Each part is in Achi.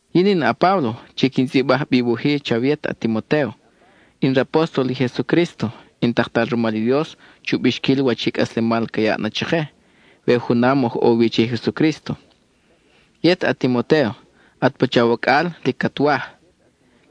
Yin in a-Páblo chi quin tzʼibaj bi i wuj-i chawe yet a-Timotéo. In rapóstol i Jesucrísto, in taktal rumal i Dios chu bixquil wach i cʼaslemal ca yaʼ na chake we junam oj ʼo wi che i Jesucrísto. Yet, a-Timotéo, at pacha wacʼal lic cat waj.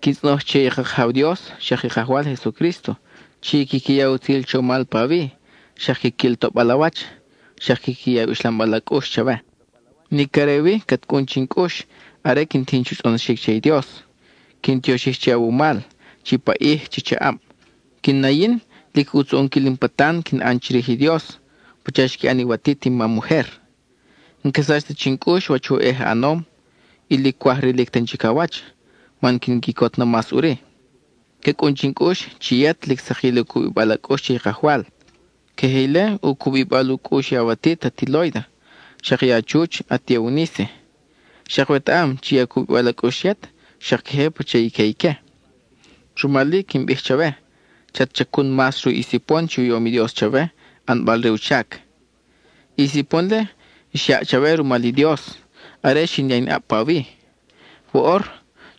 Quin tzʼonoj che i ka Kajaw Dios xak i Kajwal Jesucrísto chi quiqui ya i utzil chomal pawi, xak quiquil toʼbal a wach, xak quiqui ya i uxlambal a cʼux chawe. Nic are wi cat cʼun chin cʼux are quin tijin chu tzʼonoxic che i Dios; quin tioxij che awumal, chi paʼij, chi chaʼab. Quin na yin, lic ʼutz u ʼonquil in patan quin ʼan chirij i Dios, pacha xqui ʼan i watit in mam ujer. N-ca sach ta chin cʼux wach oʼej a ʼanom, y lic cwaj rilic tan chic a wach, man quin quicot na mas ʼuri. Ca cʼun chin cʼux chi yet lic sakil i u cubibal a cʼux che i Kajwal. Queje ile u cubibal u cʼux i awatit ati Lóida, xak i a chuch ati Euníce. Xak wetaʼam chi i u cubibal a cʼux yet xak queje pacha i que ique. Rumal-i, quin bij chawe, chat chacun mas ruʼ i sipon chi u yom i Dios chawe ʼanbal re u chac. I sipon-le, xyaʼ chawe rumal i Dios are xin ya in ʼab pawi; woʼor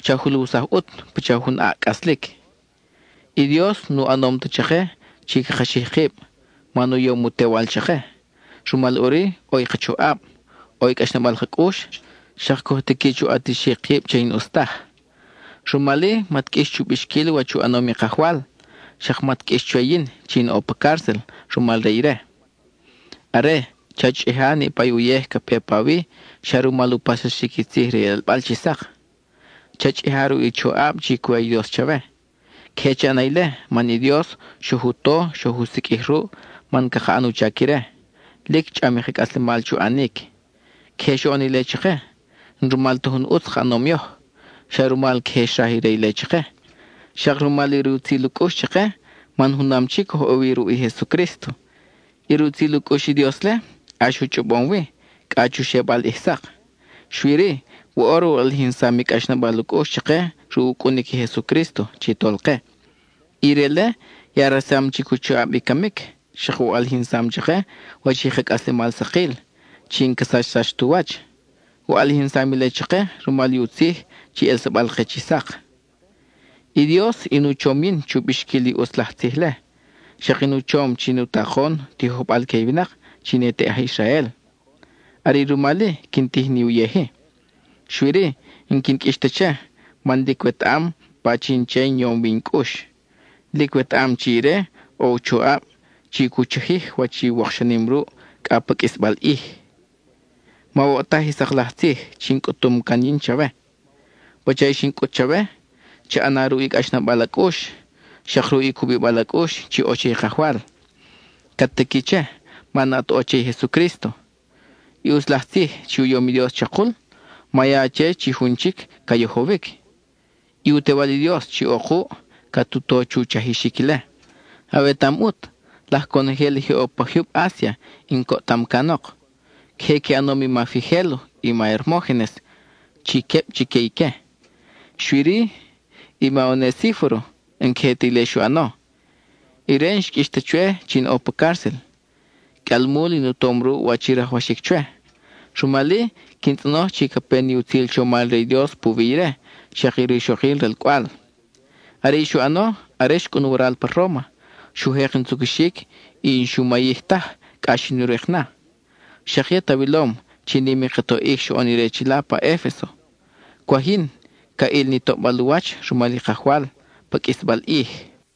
cha juluwsaj ʼut pacha jun ʼaʼ cʼaslic. I Dios nu ʼanom ta chake chi caka xij kib, man u yom u Tewal chake, rumal, ʼuri ʼo i ka choʼab, ʼo i cʼaxnabal ka cʼux, xak coj tiqui chu ʼatixic kib che i n-ʼus taj. Rumal-i, mat qʼuix chu bixquil wach u ʼanom i Kajwal; xak mat qʼuix chwe yin chi in ʼo pa cárcel rumal re ire. Are, cha chʼija niʼpa i uyej ca pe pawi xa rumal u paxsaxic i tzij re i ʼelbal chi sak. Cha chʼija ruʼ i choʼab chi cu ya i Dios chawe. Queje cha ʼana ile man i Dios xoj u to y xoj u siqʼuij ruʼ man caka ʼan u chac ire, lic chʼam i ka cʼaslemal chu ʼanic. Queje xoʼon ile chake, n-rumal ta jun ʼutz ka ʼanom yoj, xa rumal queje xraj ire ile chake, xak rumal i rutzil u cʼux chake man junam chic oj ʼo wi ruʼ i Jesucrísto. I rutzil u cʼux i Dios-le, ʼax u chʼobom wi, cʼa chu xebal ʼij sak, xui-ri, woʼor u ʼalijinsam i cʼaxnabal u cʼux chake ruʼ u cʼunic i Jesucrísto chi Tolke. Ire-le ya resam chic u choʼab i camic, xak u ʼalijinsam chake wach i ka cʼaslemal sakil, chi n-ca sachsax tu wach. U ʼalijinsam ile chake rumal i u tzij chi ʼelsabal-ke chi sak. I Dios in u chom yin chu bixquil i ʼutz laj tzij-le; xak in u chom chi in u takon, tijojbal que i winak chi ne te aj Israel. Are i rumal-i quin tij ni uyej-i. Xui-ri, n-quin qʼuix ta che, man lic wetaʼam pachin che in yom wi in cʼux; lic wetaʼam chi ire ʼo u choʼab chi cu chajij wach i wokxanim ruʼ cʼa pa qʼuisbal ʼij. Mawoʼtaj i sak laj tzij chi in cʼutum can yin chawe. Pacha i xin cʼut chawe, cha ʼana ruʼ i cʼaxnabal a cʼux, xak ruʼ i u cubibal a cʼux chi ʼo che i Kajwal; cat tiqui che man at ʼo che i Jesucrísto. I ʼutz laj tzij chi u yom i Dios chakul, ma ya che chi jun chic ca yojowic; i u Tewal i Dios chi ʼo kuʼ, cat u to chu chajixic ile. Awetaʼam ʼut, laj conojel i je ʼo pa jyub Asia in coʼtam canok; queje qui ʼanom i ma Figélo y ma Hermógenes chi queb chique ique. Xui-ri, i ma Onesíforo n-queje ta ile xu ʼano; ire n-xqʼuix ta chwe chi in ʼo pa cárcel. Qʼuialmul in u tom ruʼ wach i rajwaxic chwe; rumal-i, quin tzʼonoj chi ca pe ni utzil chomal re i Dios puwi ire xak i rixokil ralcʼwal. Are i xu ʼano, are xcʼun waral pa Róma, xu jek in tzucuxic, y n-xu mayij taj cʼa xin u rik na. Xak yet awilom chi nim i ka toʼic xoʼon ire chila pa Efeso; cwaj yin ca ʼil ni toʼbal u wach rumal i Kajwal pa qʼuisbal ʼij.